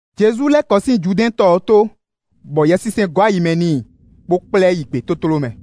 Jezu lɛ́ kɔ sín Judɛ́ɛn tɔ ɔ́ tó, bɔ Yɛsinsɛn gɔ́ ayi mɛ n'i, bó kplá ɛ yi gbětótló mɛ.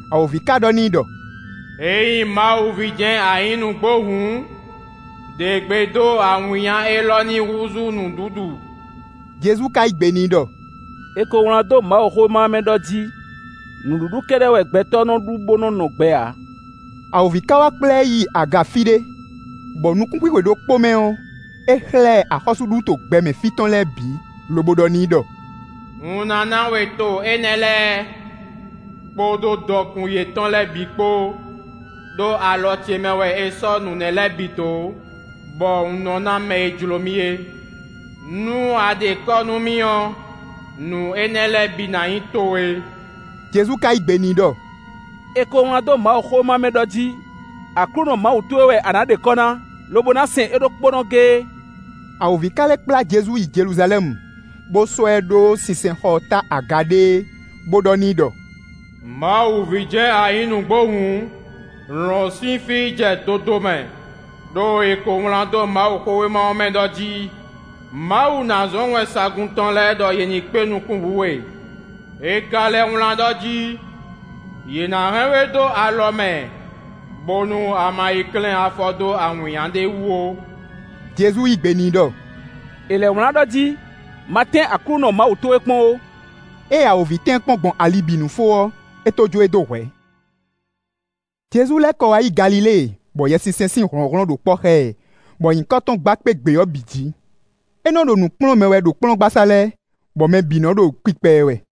Awǒvi ka ɖɔ n'i ɖɔ: “Ényí Mawu ví jɛ́n a nyǐ nǔgbó hǔn, ɖe gbe dó awǐnnya élɔ́ ní húzú nǔɖuɖu.” Jezu ka yí gbe n'i ɖɔ: “É ko wlán dó Mawuxówéma ɔ́ mɛ ɖɔ jí: ‘Nǔɖuɖu kɛ́ɖɛ́ wɛ gbɛtɔ́ nɔ ɖu, bó nɔ́ nɔ gbɛ ǎ.’” Awǒvi ka wá kplá ɛ yi aga fí ɖé, bɔ nukúnxwixwe ɖokpó mɛ ɔ́, é xlɛ́ ɛ axɔ́súɖuto gbɛmɛ fí tɔn lɛ́ɛ bǐ, lobo ɖɔ n'i ɖɔ: “Un ná ná we to énɛ́ lɛ́ɛ, kpódó dɔkun yětɔn lɛ́ɛ bǐ kpó, ɖó alɔ ce mɛ wɛ è sɔ́ nǔ lɛ́ɛ bǐ dó, bɔ un nɔ ná mɛ e jló mì é. Nú a ɖe kɔ́ nú mì ɔ́, nǔ énɛ́ lɛ́ɛ bǐ ná nyí towe.” Jezu ka yí gbe n'i ɖɔ: “È ko wlán dó Mawuxówéma ɔ́ mɛ ɖɔ jí: ‘Aklúnɔ Mawu towe wɛ a nǎ ɖe kɔ́ ná, lobo ná sɛn é ɖokpónɔ géé.’” Awǒvi ka lɛ́ kplá Jezu yi Jeluzalɛ́mu, bó sɔ́ ɛ ɖó sinsɛnxɔ ɔ́ ta aga ɖéé, bó ɖɔ n'i ɖɔ: “Mawu ví jɛ́n a nyǐ nǔgbó hǔn, lɔ̌n sín fí yi jɛ dodomɛ; ɖó è ko wlán dó Mawuxówéma ɔ́ mɛ ɖɔ jí: ‘Mawu ná zɔ́n wɛnsagun tɔn lɛ́ɛ ɖɔ yě ní kpé nukún wǔ we.’ È ka lɛ́ wlán ɖɔ jí: ‘Yě ná hɛn we dó alɔ mɛ, bónú a ma yi klɛ́n afɔ dó awǐnnya ɖé wú ó.’” Jezu yí gbe n'i ɖɔ: “È lɛ̌ wlán ɖɔ jí: ‘Ma tɛ́n Aklúnɔ Mawu towe kpɔ́n ó.’” Ée awǒvi tɛ́n ɛ kpɔ́n gbɔn ali bǐ nu fó ɔ́, é tó jó e dó hwɛ̌. Jezu lɛ́ kɔ wá yi Galilée, bɔ Yɛsinsɛn sín hlɔ̌nhlɔ́n ɖo kpɔ́ xá ɛ, bɔ nyǐkɔ tɔn gba kpé gbě ɔ́ bǐ jǐ. É nɔ́ ɖo nǔ kplɔ́n mɛ wɛ ɖo kplɔ́ngbasá lɛ́ɛ, bɔ mɛ bǐ nɔ ɖo kpikpa ɛ wɛ.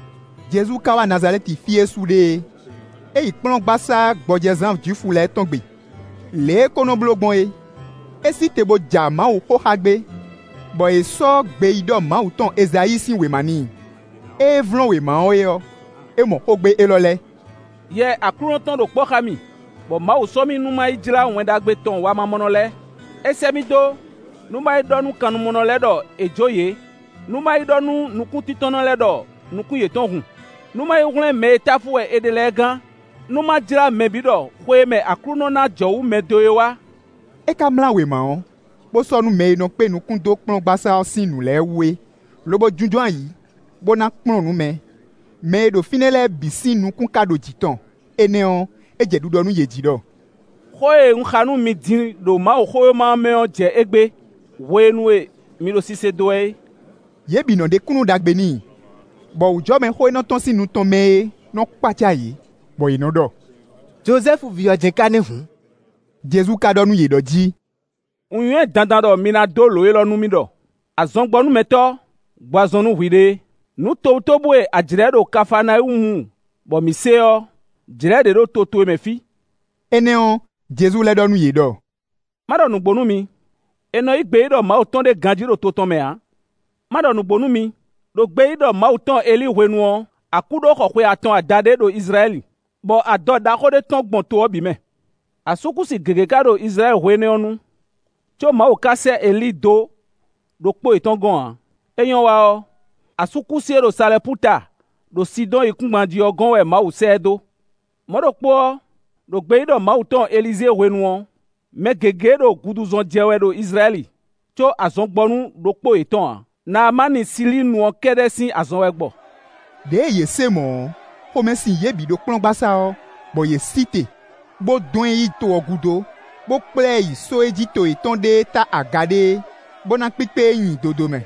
Jezu ka wá Nazalɛ́ti fí e é su ɖe é. É yi kplɔ́ngbasá gbɔjɛzán Jwifu lɛ́ɛ tɔn gbe, lě e é ko nɔ bló gbɔn é. É sí te bó ja Mawuxó xa gbé, bɔ è sɔ́ gbeyíɖɔ Mawu tɔn Ezayíi sín wěma n'i. Ée é vlɔ́n wěma ɔ́ é ɔ́, é mɔ xógbe élɔ́ lɛ́ɛ: “Yɛ Aklúnɔ tɔn ɖo kpɔ́ xá mì, bɔ Mawu sɔ́ mì nú má yi jlá Wɛn Ɖagbe tɔn wamamɔnɔ lɛ́ɛ; é sɛ́ mì dó, nú má yi ɖɔ nú kannumɔ lɛ́ɛ ɖɔ è jǒ yě; nú má yi ɖɔ nú nukúntíntɔ́nnɔ lɛ́ɛ ɖɔ nukún yětɔn hun, nú má yi hwlɛ́n mɛ e táfú wɛ è ɖe lɛ́ɛ gán. Nú má jlá mɛ bǐ ɖɔ xwe e mɛ Aklúnɔ ná jɔwǔ mɛ dó é wá.” É ka mlá wěma ɔ́, bó sɔ́ nú mɛ e nɔ kpé nukún dó kplɔ́ngbasá ɔ́ sín nǔ lɛ́ɛ wú é, lobo jínjɔ́n ayǐ, bó ná kplɔ́n nǔ mɛ. Mɛ e ɖo fínɛ́ lɛ́ɛ bǐ sín nukún ka ɖo jǐ tɔn. Énɛ́ ɔ́, é jɛ ɖiɖɔ nú yě jí ɖɔ: “Xó e un xa nú mi din ɖo Mawuxówéma ɔ́ mɛ ɔ́ jɛ égbé, hwenu e mi ɖo sise dó wɛ é.” Yě bǐ nɔ ɖe kúnnu ɖagbe n'i, bɔ wǔjɔmɛ xó e nɔ tɔ́n sín nu tɔn mɛ é nɔ́ kpácá yě, bɔ yě nɔ ɖɔ: “Jozɛ́fu ví ɔ́ jɛ́n ka nɛ́ hǔn.” Jezu ka ɖɔ nú yě ɖɔ jí: “Un nywɛ́ dandan ɖɔ mi ná dó lǒ élɔ́ nú mì ɖɔ: ‘Azɔngbɔnúmɛtɔ́, gbɔ azɔn nú hwiɖée. Nǔ tobutóbú e a jlɛ̌ ɖo Kafaanawúmu bɔ mǐ se ɔ́, jlɛ̌ ɖě ɖo to towe mɛ fí.’” Énɛ́ ɔ́, Jezu lɛ́ ɖɔ nú yě ɖɔ: “Má ɖɔ nǔgbó nú mi: è nɔ yí gbeyíɖɔ Mawu tɔn ɖé ganjí ɖo to tɔn mɛ ǎ. Má ɖɔ nǔgbó nú mi: ɖo gbeyíɖɔ Mawu tɔn Elíi hwenu ɔ́, akú ɖó xɔ xwe atɔn adaɖé ɖo Izlayɛ́li, bɔ adɔ ɖaxó ɖé tɔ́n gbɔn to ɔ́ bǐ mɛ. Asúkúsi gěgé ka ɖo Izlayɛ́li hwe énɛ́ ɔ́ nu, có Mawu ka sɛ́ Elíi dó ɖokpó yětɔn gɔ́n ǎ; é nyɔ́ wa ɔ́, asúkúsi e ɖo Salɛpúta, ɖo Sidɔ́ɔn yíkúngban jí ɔ́ gɔ́n wɛ Mawu sɛ́ ɛ dó. Mɔ̌ ɖokpó ɔ́, ɖo gbeyíɖɔ Mawu tɔn Elizée hwenu ɔ́, mɛ gěgé ɖo guduzɔn jɛ wɛ ɖo Izlayɛ́li, có azɔn gbɔ nú ɖokpó yětɔn ǎ; Naamáni Silíinu ɔ́ kɛ́ɖɛ́ sín azɔn wɛ gbɔ.” Đěe yě se mɔ̌ ɔ́, xomɛ sin yě bǐ ɖo kplɔ́ngbasá ɔ́, bɔ yě sí te, bó dɔn ɛ yi to ɔ́ gúdo, bó kplá ɛ yi só e jí to yětɔn ɖe é ta aga ɖéé, bó ná kpíkpé e nyi dodomɛ.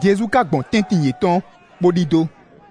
Jezu ka gbɔn tɛ́ntin yětɔn, bó ɖidó.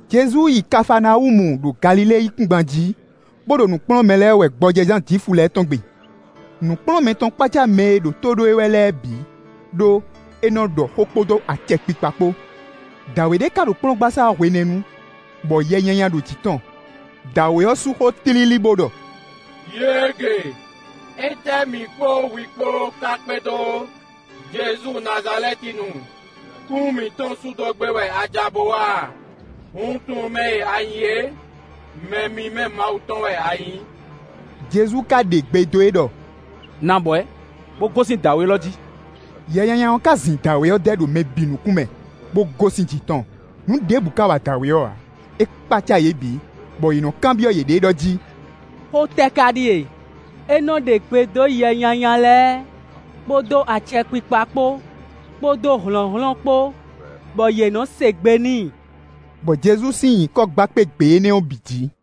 Jezu yi Kafaanawúmu ɖo Galilée yíkúngban jí, bó ɖo nǔ kplɔ́n mɛ lɛ́ɛ wɛ gbɔjɛzán Jwifu lɛ́ɛ tɔn gbe. Nǔkplɔ́nmɛ tɔn kpácá mɛ e ɖo tó ɖó e wɛ lɛ́ɛ bǐ, ɖó é nɔ́ ɖɔ xó kpódó acɛkpikpa kpó. Dǎwe ɖé ka ɖo kplɔ́ngbasá ɔ́ hwenɛ́nu, bɔ yɛ nyanya ɖo jǐ tɔn. Dǎwe ɔ́ sú xó tlílí bó ɖɔ: “Yěege! Étɛ́ mǐ kpó hwi kpó ká kpédó, Jezu Nazalɛ́tinu? Kún mǐtɔn sú dó gbé wɛ a ja bó wá a? Un tunwun mɛ e a nyǐ é; mɛ mímɛ́ Mawu tɔ́n wɛ a nyǐ.” Jezu ka ɖe gbe dó e ɖɔ: “Nɔ abwɛ̌, bó gosín dǎwe élɔ́ jí.” Yɛ nyanya ɔ́ ka zin dǎwe ɔ́ dɛ́ ɖo mɛ bǐ nukún mɛ, bó gosín jǐ tɔn, nǔ ɖěbǔ ka wa dǎwe ɔ́ ǎ. É kpácá yě bǐ, bɔ yě nɔ́ kanbyɔ́ yěɖée ɖɔ jí: “Xó tɛ́ ká ɖíe? É nɔ́ ɖe gbe dó yɛ nyanya lɛ́ɛ, kpódó acɛkpikpa kpó, kpódó hlɔ̌nhlɔ́n kpó, bɔ yě nɔ́ se gbe n'i.” Bɔ Jezu sín nyǐkɔ gba kpé gbě énɛ́ ɔ́ bǐ jǐ.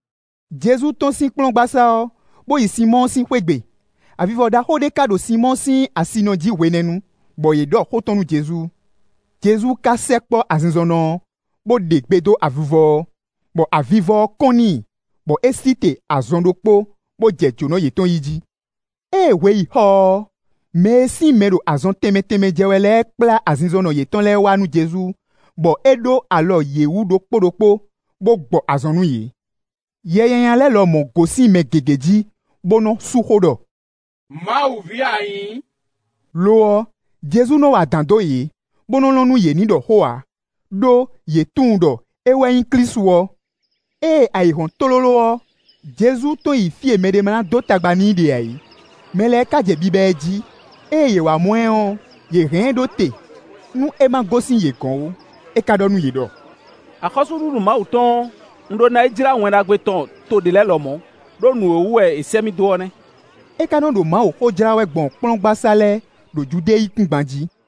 Jezu tɔ́n sín kplɔ́ngbasá ɔ́, bó yi Sinmɔ́ɔ sín xwé gbe. Avivɔ ɖaxó ɖé ká ɖo Sinmɔ́ɔ sín asinɔ jí hwenɛ́nu, bɔ yě ɖɔ xó tɔn nú Jezu. Jezu ka sɛkpɔ́ azinzɔnnɔ ɔ́, bó ɖe gbe dó avivɔ ɔ́, bɔ avivɔ ɔ́ kɔ́n n'i, bɔ é sí te azɔn ɖokpó, bó jɛ jǒnɔ yětɔn yí jí. Ée hwe yi xɔ ɔ́, mɛ e sín mɛ ɖo azɔn tɛnmɛ tɛnmɛ jɛ wɛ lɛ́ɛ kplá azinzɔnnɔ yětɔn lɛ́ɛ wá nú Jezu, bɔ é ɖó alɔ yě wú ɖokpó ɖokpó, bó gbɔ azɔn nú yě. Yɛ nyanya lɛ́ɛ lɔmɔ̌ gosín mɛ gěgé jí, bó nɔ́ sú xó ɖɔ: “Mawu ví wɛ a nyǐ.” Lo ɔ́, Jezu nɔ wa adǎn dó yě, bó nɔ́ lɔn nú yě ní ɖɔ xó ǎ, ɖó yě tunwun ɖɔ é wɛ nyí Klísu ɔ́. Ée ayǐ hɔ́n tlóló ɔ́, Jezu tɔ́n yi fí e mɛɖé má ná dó tagba n'i ɖe ǎ é. Mɛ lɛ́ɛ ka jɛ biba ɛ jí. Ée yě wá mɔ ɛ ɔ́, yě hɛn ɛ ɖó te nú é má gosín yě gɔ̌n ó. É ka ɖɔ nú yě ɖɔ: “Axɔ́súɖuɖu Mawu tɔn ɔ́, un ɖó ná yi jlá Wɛn Ɖagbe tɔn to ɖě lɛ́ɛ lɔmɔ̌, ɖó nǔ è wú wɛ è sɛ́ mì dó ɔ́ nɛ́.” É ka nɔ ɖo Mawuxó jlá wɛ gbɔn kplɔ́ngbasá lɛ́ɛ, ɖo Judée yíkúngban jí.